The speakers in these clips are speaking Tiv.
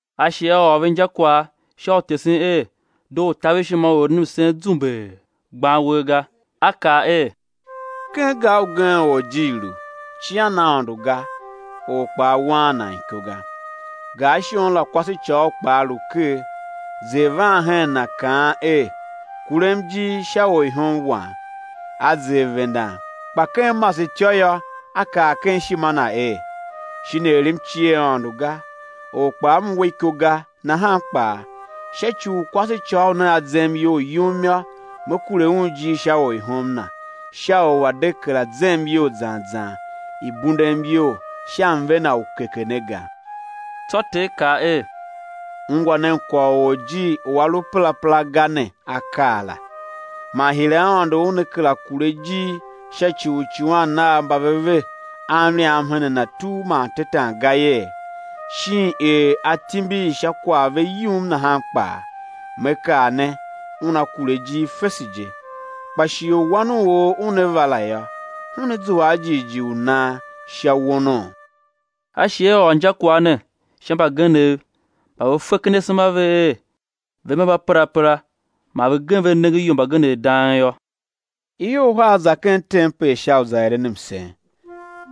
A shi A ôr ve injakwagh sha u tesen er doo u taver ishima u eren msen zumbee, gban uwer ga. A kaa er: Ken gar ugen orjir lu, cian Aôndo ga, or kpaa waan nan iko ga. Gar shon la kwasecôghol kpaa lu ker, zer van hen na, kaan er: Kurem ijir sha orihom wam. A zer vendan, kpa ken masetyô yô, a kaa ken ishima na er: Shin er m cie Aôndo ga, or kpaa m we iko ga, nahan kpaa sha ci u kwasecôghol ne a zem iyol yum yô, me kure un ijir sha orihom na, sha u a̱ de kera zem iyol zan zan i̱ bundem iyol sha mve na u keke ne ga. Tsô Ter kaa er: Ungwa nen kwagh u orjir u a lu perapera ga ne a kaa la. Man hire Aôndo Una kera kure ijir sha ci u uicuwan Nav mba ve ve a mliam hen Na tugh man tetan ga yee, shin er A timbir sha kwagh ve yum nahan kpaa. Me kaa ne, Una kure ijir fese je. Kpa shighe u Wan u or Una va la yô, Una zua a jighjigh u nan sha wonoo? A shi A ôr injakwagh ne sha mbagenev mba ve fe ken asema a ve er, ve mba mbaperapera, man ve gem ve nengen ior mbagenev dang yô: Ior uhar za ken tempel sha u za eren msen;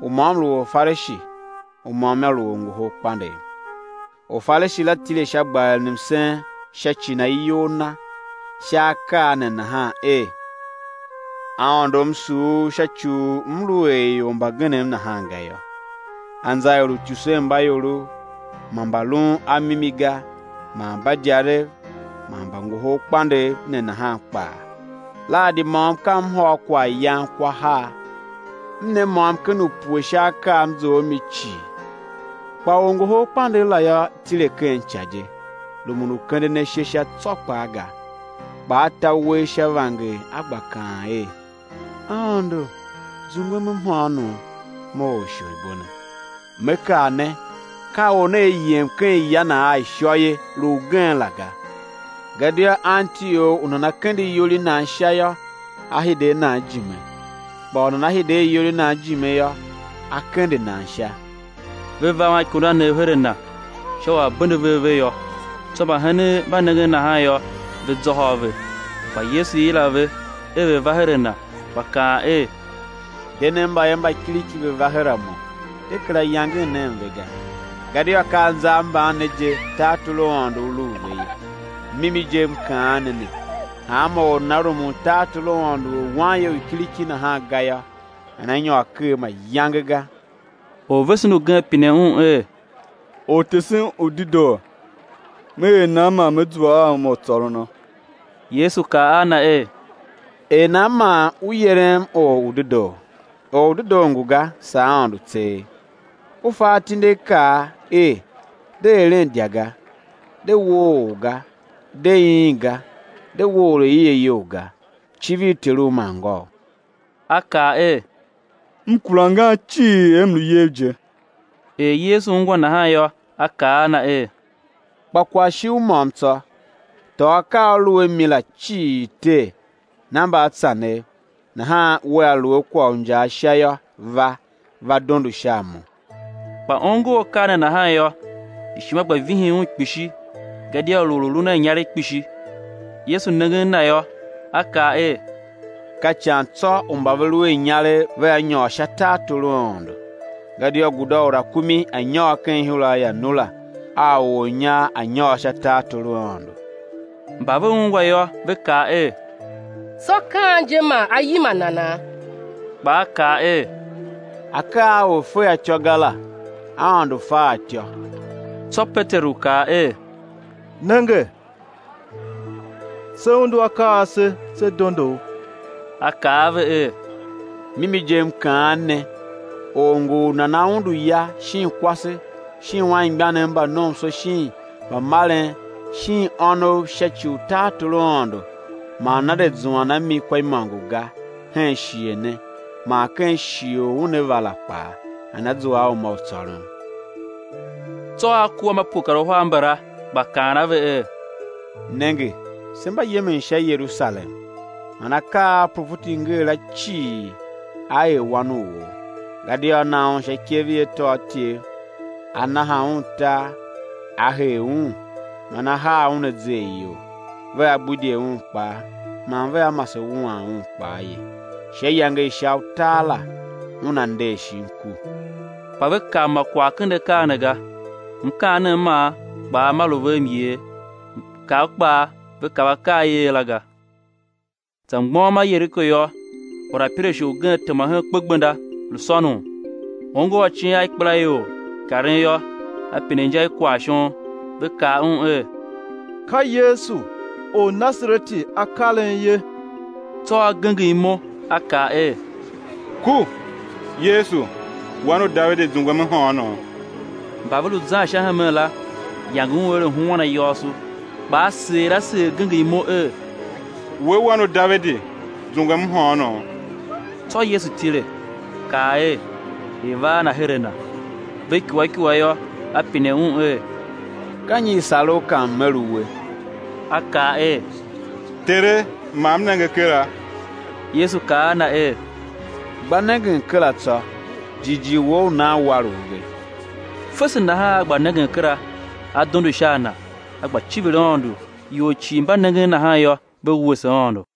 u môm lu Orfarishi; u môm yô, lu orngoholkpandegh. Orfarishi la tile sha, gba eren msen sha ci na iyol na sha akaa ne nahan er: Aôndo, m sugh U sha ci u m lu er ior mbagenev nahan ga yô; anza er uityusenmbaiorov man mba lun a mimi ga man mbadyarev man orngoholkpandegh ne nahan kpaa. Lahadi môm ka m hôr kwaghyan kwa har; m ne môm-ken-upue sha akaa a m zough a mi cii. Kpa orngoholkpandegh la yô, tile ken ica je, rumun u kenden ashe sha tsô kpaa ga, kpa a ta uwegh sha vanger, a gba kaan er: Aôndo, zungwem mhôônom, mo orsholibo ne! Me kaa ne, ka or ne a yem ken ya na a ishô ye, lu ugen la ga, gadia anti or u nana kende iyol i nan sha yô, á hide a nan ijime; kpa u nana hide a iyol i nan ijime yô, á kende nan sha. Ve va a anikundanev her a Na, sha u A̱ bende ve ave yô; tsô mbahenen mba nengen nahan yô, ve zôhô a ve. Kpa Yesu yila ve er ve̱ va her a Na, gba kaan er: De nen mbayev mba kiriki ve̱ va her a Mo, de kera yangen nen ve ga, gadia ka anza a mban ne je tartor u Aôndo u lu u ve ye. Mimi je M kaan ne ne, hanma or u nana rumun tartor u Aôndo er wanye u kiriki nahan ga yô, nana nyôr ker mayange ga. Orvesen ugen pine Un er: Ortesen u dedoo, me er nan man me zua a uma u tsôrono? Yesu kaa a na er: Er nan man u yerem Or u dedoo? Or u dedoo ngu ga, saa Aôndo tseegh. U fa atindiakaa er: De eren idya ga; de woo or ga; de iin ga; de we or aie iyol ga; civir teru man ngôu. A kaa er: M kura angan cii er m lu iyev je. Er Yesu ungwa nahan yô, A kaa a na er: Kpa kwagh shi u môm tsô: Tôô akaa a u lu a mi la cii tee, na mbaatsanev nahan wea lu a kwagh u injaa Sha yô, va, va dondo sha a Mo. Kpa ongo akaa ne nahan yô, ishima gba vihin un kpishi gadia lu or u lun a inyaregh kpishi. Yesu nengen na yô, A kaa er: Ka ican tsô u mba ve lu a inyaregh vea nyôr sha tartor u Aôndo. Gadia guda u rakumi a̱ nyôr ken ihura i anura, a u ornyar a̱ nyôr sha tartor u Aôndo. Mba ve ungwa yô, ve kaa er: Tsô ka an je man á yima nana? Kpa A kaa er: Akaa a or fe a ityô ga la, Aôndo fe a ityô. Tsô Peteru kaa er: Nenge, se undu akaa ase, se dondo U. A kaa a ve er: Mimi je, M ngu kaan ne, or ngu u nana undu ya, shin kwase, shin anmgbianev mba nomso shin mbamaren shin ônov sha ci u tartor u Aôndo, man nana de zuan a mi kwa imôngo ga hen shighe ne, man ken shighe u una va la kpaa nana zua a uma u tsôron. Tsô A kua a mba pue kar uhar mbala gba kaan a ve er: Nenge, se mba zan sha Yerusalem, man akaa a uprofeti nger la cii, aa er Wan u or. Gadia á na Un sha ikev i atôatyev, á naha Un tar, á hee Un, man á haa Un azer iyol; vea gbidye Un akpa, man vea mase wuan Un kpaa ye; sha iyange i sha utar la Una nder shin ku. Kpa ve kav ma kwagh ken akaa ne ga, mkaanem man kpaa ma lu ve myer; mkav kpaa ve kav akaa a i er la ga. Za mgbôghom a Yeriko yô, orapirashe ugen tema hen kpegbenda, lu sônon. Ongo acin a ikpelaior i karen yô, a pine inja i kwagh shon. Ve kaa un er: Ka Yesu, Ornasareti a karen ye. Tsô a genger imo, a kaa er: Ku! Yesu, Wan u Davidi, zungwem mhôônom! Mba ve lu zan sha hemen la, yange un er a̱ huan ayôôso. Kpa a seer a seer genger imo er: We, Wan u Davidi, zungwem mhôônom. Tsô Yesu tile, kaa er, i̱ va a na her a Na. Ve ikua ikua yô, A pine un er: Ka nyi i sar u ka M̱ er uwe? A kaa er: Tere, ma m nenge kera! Yesu kaa a na er: Gba nengen kera tsô. Jighjigh wou u nan war u ve. Fese nahan a gba nengen kera, a dondo sha a Na, a gba civir Aôndo. Ior cii mba nengen nahan yô, ve wuese Aôndo.